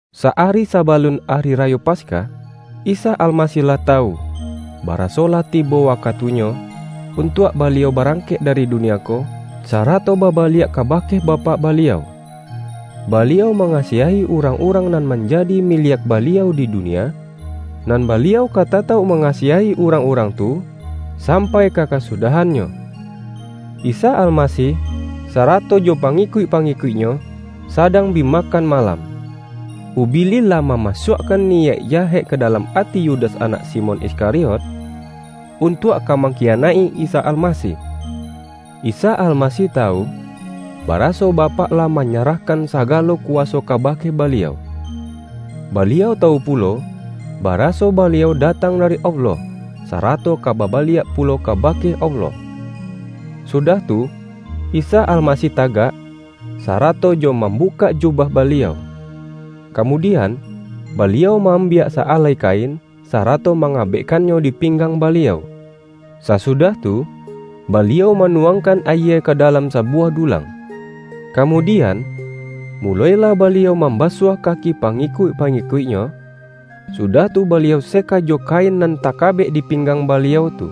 Sa-ari sabalun Ari Rayo Pas-kah, Isa Almasih lah tawu, baraso lah tibo wakatunyo, untuak Baliau barangkek dari dunia ko, sarato babaliak kabake Bapak Baliau. Baliau mangasiahi urang-urang nan manja-di miliak Baliau di dunia, nan Baliau ka tatauk mangasiahi urang-urang tu sampai ka kasudahannyo. Isa Almasih sarato jo pangikuik-pangikuik-Nyo, sadang bi makan ma-lam. Ubilih lah mamasuakkan niyaik jahek ka dalam ati Yudas anak Simon Iskariot, untuak ka mangkiyanaik-i Isa Almasih. Isa Almasih tawu, baraso Bapak lah manyarahkan sagalo kuwa-so kabake Baliau. Baliau tawu pulo, baraso Baliau datang dari Allah, sa-rato ka babaliak pulo kabake Allah. Sudah tu, Isa Almasih tagak, saratojo mambukak jubah Baliau. Kamudian, Baliau ma-ambiak sa-alai kain, sarato mangabekkannyo di pinggang Baliau. Sasudah tu, Baliau manuwangkan ayie ka dalam sabuwah dulang, ka-mudian, mulo-ilah Baliau mambasuah kaki pangikuik-pangikuik-Nyo, sudah tu, Baliau seka jo kain nan takabek dipinggang Baliau tu.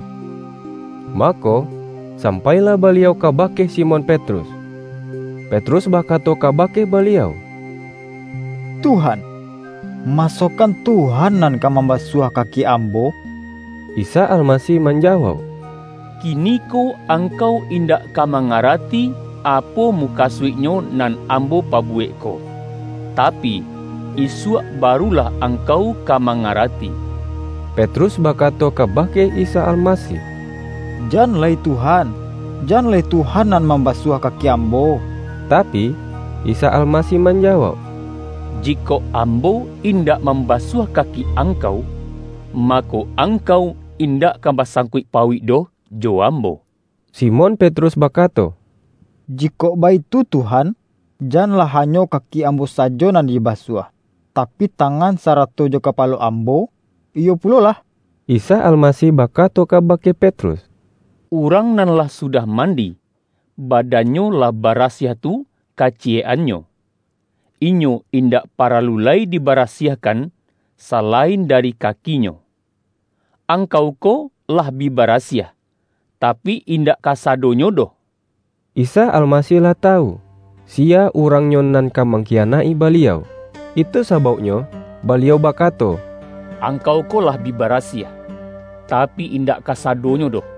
Mako, sam-pailah Baliau kabake Simon Petrus. Petrus bakato kabake Baliau:”Tuhan, masokan Tuhan nan ka mambasuah kaki ambo?” Isa Almasih manjawauk,”Kiniko angkau indak ka mangarati, apo mu-kasuiknyo nan Ambo pabuwek ko, ta-pi, isuak barulah angkau ka manga-rati.” Petrus bakato kabake Isa Almasih,”Jan lai Tuhan. Jan lai Tuhan nan mam basuah kaki ambo!” Tapi, Isa Almasih manjawauk,”Ji-kok Ambo indak mambasuah kaki ang-kau, mako, angkau indak ka basang-kuik-pauik doh jo Ambo.” Simon Petrus bakato,”Jikok baitu, Tuhan, janlah hanyo kaki ambo sajo nan dibasuah, tapi, tangan sarato jo kapalo ambo, iyo pulo lah!” Isa Almasih bakato kabake Petrus,”Urang nan lah sudah mandi, badan-nyo lah barasiah tu kaciyek-annyo. Inyo indak paralu lai dibarasiahkan, salain dari kakinyo. Angkau ko lah bi barasiah, tapi, indak kasadonyo doh.” ( Isa Almasih lah tawu, siya urang-nyo nan ka mangkiyanaik-i Baliau. Itu sabauknyo Baliau bakato,”Ang-kau ko lah bi barasiah, tapi, indak ka-sadonyo doh.")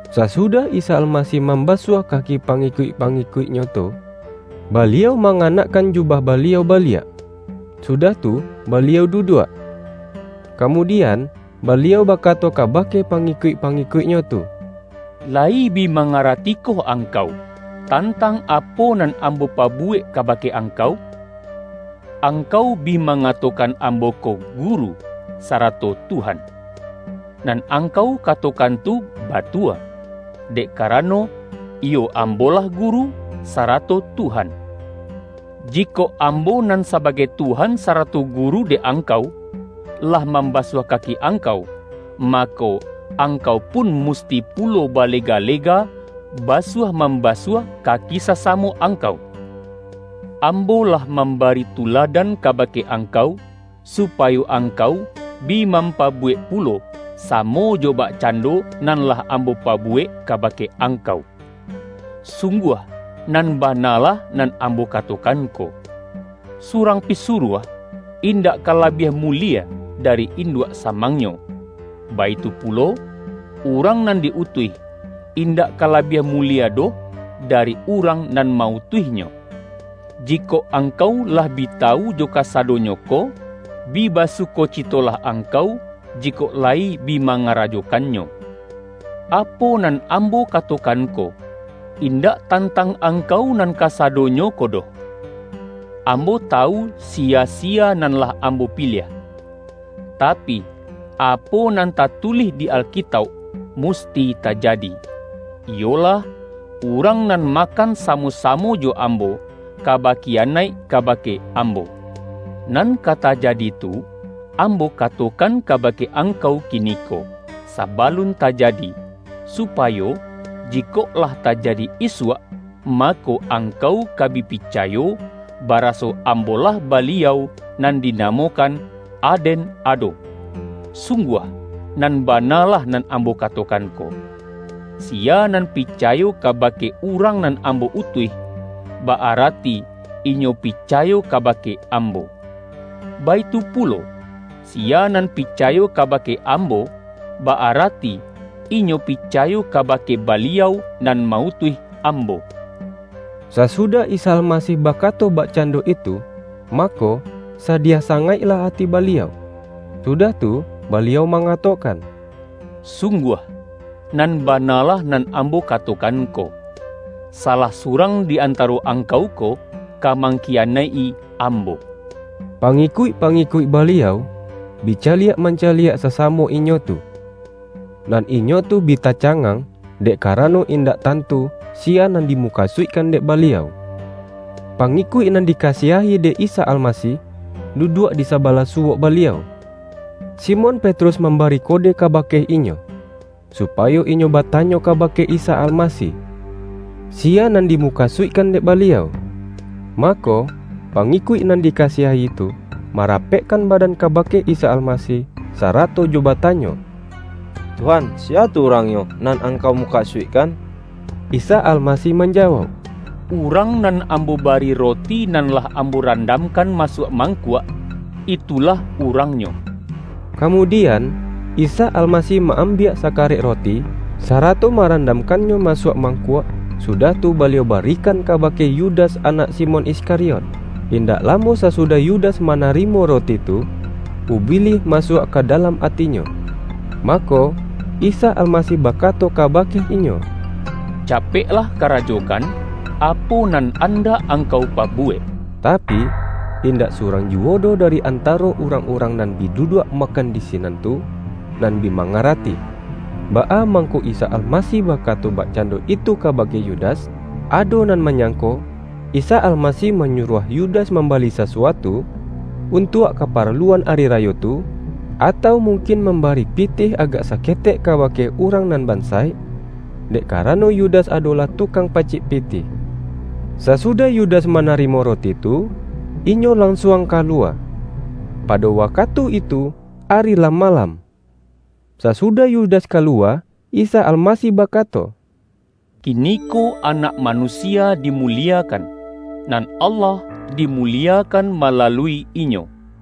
Sasudah Isa Almasih mamba-suah kaki pangikuik-pangikuik-Nyo tu, Baliau manganakkan jubah Ba-liau baliak, sudah tu Baliau duduak. Kamudian, Baliau bakato kabake pa-ngikuik-pangikuik-Nyo tu,”Layi bi mangaratikoh angkau, tantang apo nan Ambo pabuwek kabake angkau? Angkau bi mangatokan Ambo ko, Guru sarato Tuhan. Nan angkau ka-tokan tu batua, dek karano, iyo Ambo-lah Guru sarato Tuhan. Jikok Ambo nan sabagai Tuhan, sarato Gu-ru dek angkau, lah mambasuah kaki angkau, mako, angkau pun musti pu-lo balega-lega, basuah-mambasuah ka-ki sasamo angkau. Ambo lah mam-bari tuladan kabake angkau, supayo angkau bi mampabuwek pulo, samo jo bakcando nan lah Ambo pabuwek kabake angkau. Sungguah, nan ba-na lah nan Ambo katokan ko: Surang pisuruah, indak ka labiah mulie dari induak samangnyo, baitu pulo, urang nan di-utuih, indak ka labiah mulie doh dari urang nan ma-utuihnyo. Jikok angkau lah bi tawu jo kasadonyo ko, bi basukocitolah angkau, jikok layi bi mangarajokannyo. Apo nan Ambo katokan ko, indak tantang angkau nan kasadonyo ko doh. Ambo tawu siya-siya nan lah Ambo pi-liah. Tapi, apo nan tatulih di Alkitauk, musti tajadi, iyolah ’Urang nan makan samo-samo jo Ambo, ka bakiyanaik ka-bake Ambo.’ Nan ka tajadi tu, Ambo katokan kabake angkau kiniko, sabalun tajadi, supayo, jikok lah tajadi isuak, ma-ko, angkau ka bi picayo, baraso Ambo-lah Baliau, nan dinamokan, ADEN ADO. Sungguah, nan bana lah nan Am-bo katokan ko: Siya nan picayo kabake urang nan Ambo utuih, ba-arati inyo pi-cayo kabake Ambo. Baitu pulo, siya nan picayo kabake Ambo, ba-arati inyo pica-yo kabake Baliau, nan ma-utuih Ambo.” Sasudah Isa Almasih bakato bak-cando itu, mako, sadiah sangaiklah ati Baliau. Sudah tu, Baliau mangatokan,”Sungguah, nan bana lah nan Ambo ka-tokan ko: Salah surang di antaro ang-kau ko, ka mangkiyanaik-i Ambo.” Pangikuik-pangikuik Baliau, bi caliak mancaliak sasamo inyo tu, nan inyo tu bi tacangang, dek karano in-dak tantu, siya nan dimukasuikkan dek Baliau. Pangikuik nan dikasiahi dek Isa Almasih, duduak di sabalah su-wok Baliau. Simon Petrus mambari kode kabake inyo, supayo inyo bata-nyo kabake Isa Almasih, siya nan di-mukasuikkan dek Baliau. Mako, pangikuik nan dikasiahi tu, marapekkan badan kabake Isa Almasih, sarato jo batanyo,”Tuhan siya tu urangnyo nan Angkau muka-suikkan?” Isa Almasih manjawauk,”Urang nan Ambo bari roti nan lah Ambo ran-damkan masuak mangkuak, itulah urangnyo.” Kamudian, Isa Almasih ma-ambiak sakarek roti, sarato ma-randamkannyo masuak mangkuak, sudah tu, Baliau barikan kabake Yu-das anak Simon Iskariot. Indak lamo sasudah Yudas manarimo roti tu, Ubi-lih masuak ka dalam atinyo. Mako, Isa Almasih bakato kabake inyo,”Capek-lah karajokan, apo nan andak angkau pabuwek.” Tapi, indak surang juwo doh dari antaro urang-urang nan bi duduak makan di sinan tu, nan bi ma-ngarati. Baa mangko Isa Almasih baka-to bakcando itu kabake Yudas. Ado nan manyangko, Isa Almasih manyu-ruah Yudas mambali sasuatu, untuak kaparaluan ari rayo tu, atau mungkin mambari pitih agak saketek kabake urang nan bansaik== dek karano Yu-das adolah tukang pacik pitih. Sasudah Yudas manarimo roti tu, inyo lansuang kaluwa. Pado wakatu itu ari lah malam. Sasudah Yudas kaluwa, Isa Almasih bakato,”Kiniko Anak Manusia dimu-liekan, nan Allah dimuliekan malalui Inyo.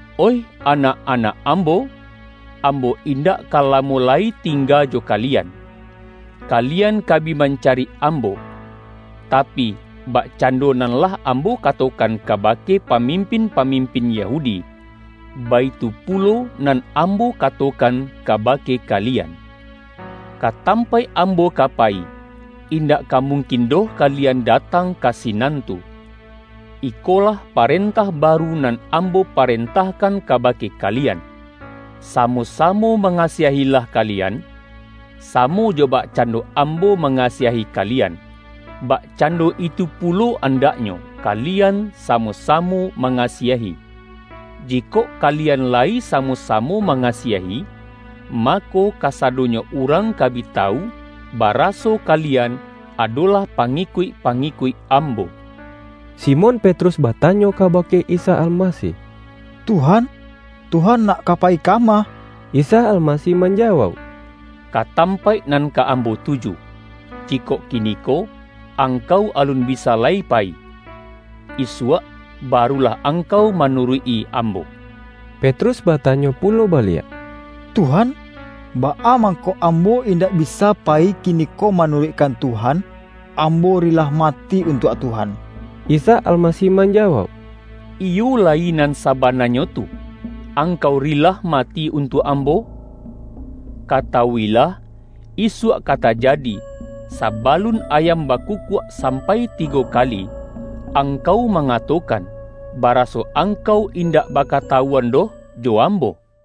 Oih anak-anak Ambo, Ambo indak ka lamo lai tingga jo ka-lian. Kalian ka bi mancari Ambo, ta-pi, bakcando nan lah Ambo katokan kabake pamimpin-pamimpin Yahudi, baitu pulo nan Ambo katokan kabake kalian. Ka tampaik Ambo ka payi, in-dak ka mungkin doh kalian datang ka sinan tu. Ikolah parentah baru nan Ambo parentahkan kabake kalian: Sa-mo-samo mangasiah-ilah kalian. Samo jo bakcando Ambo mangasiahi kali-an, bakcando itu pulo andaknyo, ka-lian samo-samo mangasiahi. Jikok kalian layi samo-samo mangasiahi, mako, kasadonyo urang ka bi tawu, baraso kalian adolah pangikuik-pa-ngikuik Ambo.” Simon Petrus batanyo kabake Isa Almasih,”Tuhan, Tuhan nak ka payi kama?” Isa Almasih manjawauk,”Ka tampaik nan ka Ambo tuju, jikok ki-niko, angkau alun bisa lai payi. Isuak, barulah angkau manuruik-i Ambo.” Petrus batanyo pulo baliak,”Tuhan, baa mangko ambo indak bi-sa payi kiniko manuruikkan Tuhan? Ambo rilah mati untuak Tuhan!” Isa Almasih manjawauk,”Iyo layi nan sabananyo tu, angkau rilah mati untuak Ambo? Katawuilah, isuak ka tajadi, sabalun ayam bakukuak, sam-pai tigo kali angkau mangatokan, ba-raso angkau indak bakatawuan doh jo Ambo!” YAHYA